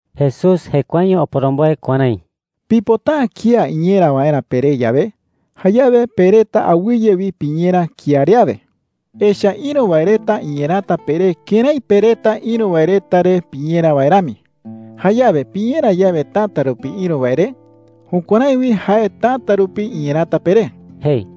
Jesús jekuaeño oporomboe kuärái: “Pipota’ä kía iñera waerä peré yawe, jayawe pe reta awɨye wi piñera kía re awe. Echa’ä ïru wae reta iñerata peré kërái pe reta ïru wae reta re piñera wae rami. Jayawe piñera yawe täta rupi ïru wae re, jukuärái wi jae täta rupi iñerata peré,” jei.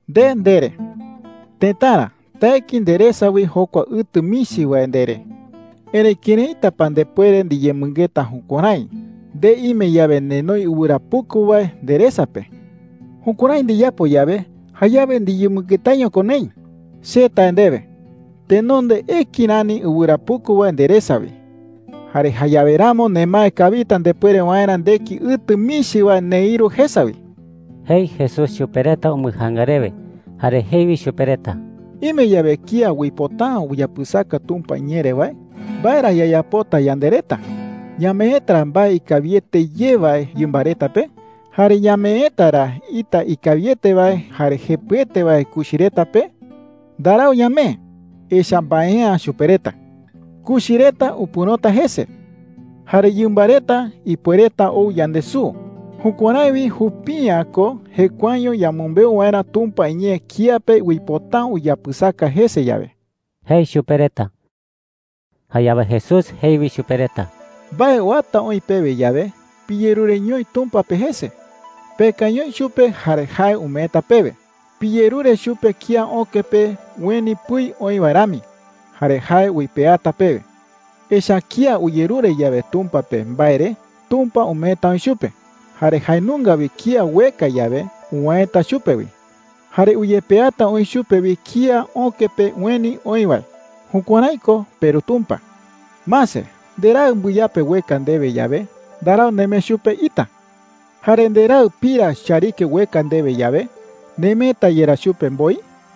“Nde ndere: ‘Tëtara, taeki nderesa wi jokua ɨtɨ michi wae,’ ndere. Erëi ¿këraita pa ndepuere ndiyemɨngeta jukuärái nde ime yawe nenoi ɨwɨra puku wae nderesa pe? Jukuärái ndiyapo yawe, jayawe ndiyemɨngetaiño ko neï,” jei. “Che tae ndewe, tenonde eki rani ɨwɨra puku wae nderesa wi. Jare jayawe ramo nemae kawita ndepuere waerä ndeki ɨtɨ michi wae neïru jesa wi,” jei Jesús chupe reta umbɨjaanga rewe. Jare jei wi chupe reta: “Ime yawe kía uipota’ä uyapɨsaka Tumpa iñee re wae, ¿mbae ra yayapota yande reta? ¿Ñameeta ra mbae ikawiete ye wae yɨmba reta pe? Jare ¿ñameeta ra ita ikawiete wae jare jepɨete wae kuchi reta pe? Ndarau ñamee, echa’ä mbae’ä chupe reta. Kuchi reta upɨ̈roñota jese, jare yɨmba reta ipuereta ou yandesuu. Jukuärái wi jupi’ä ko jekuaeño yamɨmbeu waerä Tumpa iñee kía pe uipota’ä uyapɨsaka jese yawe,” jei chupe reta. Jayawe Jesús jei wi chupe reta: “Mbae uata oï pewe yawe, piyerureñoi Tumpa pe jese. Pekañoi chupe jare jae umeeta pewe. Piyerure chupe kía öke pe ueni pɨi oï wae rami, jare jae uipeata pewe,” jei. “Echa’ä kía uyerure yawe Tumpa pe mbae re, Tumpa umeeta oï chupe. Jare jae nunga wi kía ueka yawe, uwäeta chupe wi. Jare uyepeata oï chupe wi kía öke pe ueni oï wae. Jukuärái ko peRu Tumpa,” jei. “Mase. Nderaɨ mbɨyape ueka ndewe yawe, ndarau nemee chupe ita. Jare nderaɨ pira chariki ueka ndewe yawe, ¿nemeeta yerá chupe mboi?” jei.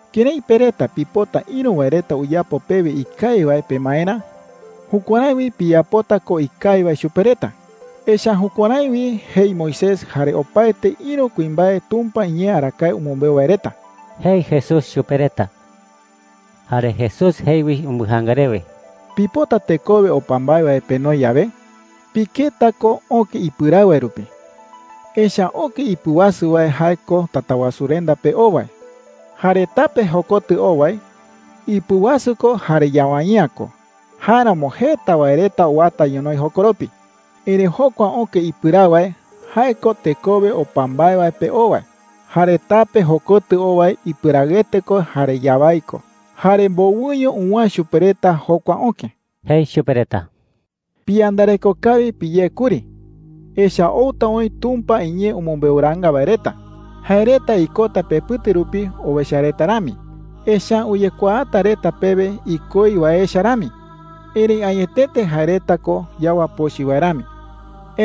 “Kërái pe reta pipota ïru wae reta uyapo pewe ikawi wae pemaerä, jukuärái wi piyapota ko ikawi wae chupe reta. Echa’ä jukuärái wi jei Moisés jare opaete ïru kuimbae Tumpa iñee arakae umɨmbeu wae reta,” jei Jesús chupe reta. Jare Jesús jei wi umbɨjaanga rewe: “Pipota tekowe opa mbae wae penoi yawe, piketa ko öke ipɨraɨ wae rupi,” jei. “Echa’ä öke ipɨwasu wae jae ko Tatawasurenda pe oo wae. Jare tape jokotɨ oo wae, ipɨwasu ko jare yawai’ä ko. Jáeramo jeta wae reta uwata ñonoï jokoropi,” jei. “Erëi jokua öke ipɨraɨ wae, jae ko tekowe opa mbae wae pe oo wae. Jare tape jokotɨ oo wae ipɨraɨete ko jare yawái ko. Jare mbowɨño uwäe chupe reta jokua öke,” jei chupe reta. “Piyandareko kawi piyé kuri, echa’ä outa oï Tumpa iñee umɨmbeuraanga wae reta. Jae reta ikota pepɨte rupi owecha reta rami, echa’ä uyekuaata reta pewe ikoi wae echa rami. Erëi añetete jae reta ko yawa pochɨ wae rami,” jei.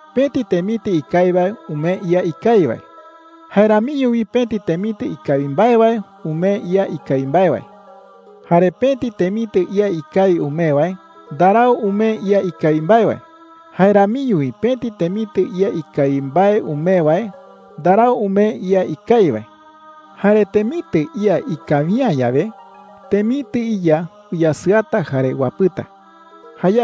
“Pëti temitɨ ikawi wae umee ía ikawi wae. Jae ramiño wi pëti temitɨ ikawi mbae wae umee ía ikawi mbae wae,” jei. “Jare pëti temitɨ ía ikawi umee wae ndarau umee ía ikawi mbae wae. Jae ramiño wi pëti temitɨ ía ikawi mbae umee wae ndarau umee ía ikawi wae. Jare temitɨ ía ikawi’ä yawe, temitɨ iya uyasɨata jare uapɨta,” jei.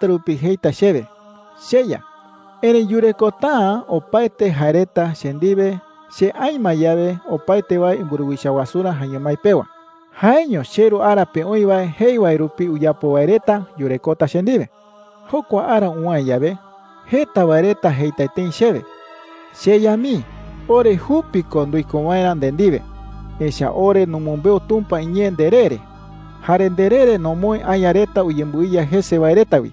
“Jeta wae reta täta rupi jeita chewe, ‘CheYa,’ erëi yurekota’ä opaete jae reta che ndiwe che aï ma yawe opaete wae imburuwicha wasurä jaeño mái pewa. Jaeño cheRu ara pe oï wae jei wae rupi uyapo wae reta yurekota che ndiwe,” jei. “Jokua ara uwäe yawe, jeta wae reta jeita tëi chewe: ‘CheYa mii, ore jupi ko nduiko waerä nde ndiwe, echa’ä ore numɨmbeu Tumpa iñee nderee re. Jare nderee re nomoë aña reta uyembɨiya jese wae reta wi.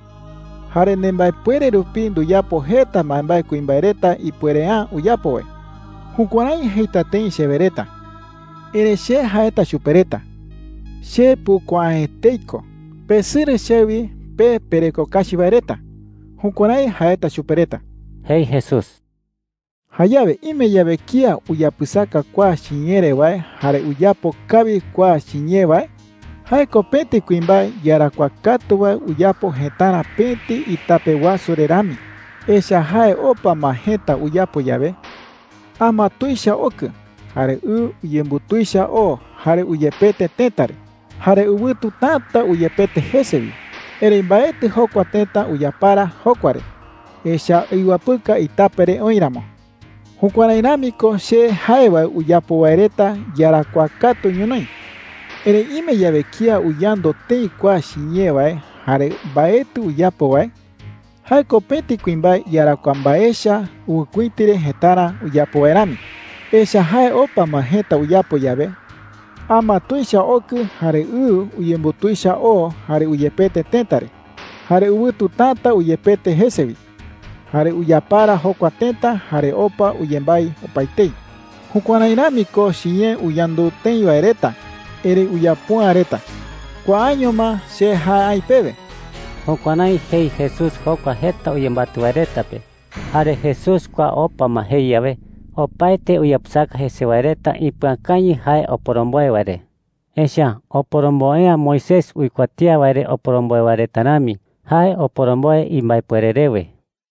Jare nembaepuere rupi nduyapo jeta mbaembae kuimbae reta ipuere’ä uyapo wae.’ Jukuärái jeita tëi chewe reta. Erëi che jaeta chupe reta: ‘Che pukuaa’ä etei ko. Pesɨrɨ chewi, pe pereko kachi wae reta.’ Jukuärái jaeta chupe reta,” jei Jesús. “Jayawe ime yawe kía uyapɨsaka kua chiñee re wae jare uyapo kawi kua chiñee wae, jae ko pëti kuimbae iyarakuaa katu wae uyapo jëtarä pëti itape wasu re rami,” jei. “Echa’ä jae opa ma jëta uyapo yawe, ama tuicha okɨ, jare ɨ uyembutuicha oo jare uyepete tëta re. Jare ɨwɨtu täta uyepete jese wi. Erëi mbaetɨ jokua tëta uyapara jokua re, echa’ä iwapɨka itape re oï ramo,” jei. “Jukuärái rami ko che jae wae uyapo wae reta iyarakuaa katu ñonoï,” jei. “Erëi ime yawe kía uyandu tëi kua chiñee wae jare mbaetɨ uyapo wae, jae ko pëti kuimbae iyarakuaa mbae echa ɨwɨkuïti re jëtarä uyapo wae rami,” jei. “Echa’ä jae opa ma jëta uyapo yawe, ama tuicha okɨ, jare ɨ uyembutuicha oo jare uyepete tëta re. Jare ɨwɨtu täta uyepete jese wi. Jare uyapara jokua tëta jare opa uyembái opaetei,” jei. “Jukuärái rami ko chiñee uyandu tëi wae reta erëi uyapo’ä reta,” jei. “Kuaaño ma che jae aï pewe.” Jukuärái jei Jesús jokua jeta uyembatɨ wae reta pe. Jare Jesús kua opa ma jei yawe, opaete uyapɨsaka jese wae reta ipɨakañɨ jae oporomboe wae re. Echa’ä oporomboe’ä Moisés uikuatía wae re oporomboe wae reta rami. Jae oporomboe imbaepuere rewe.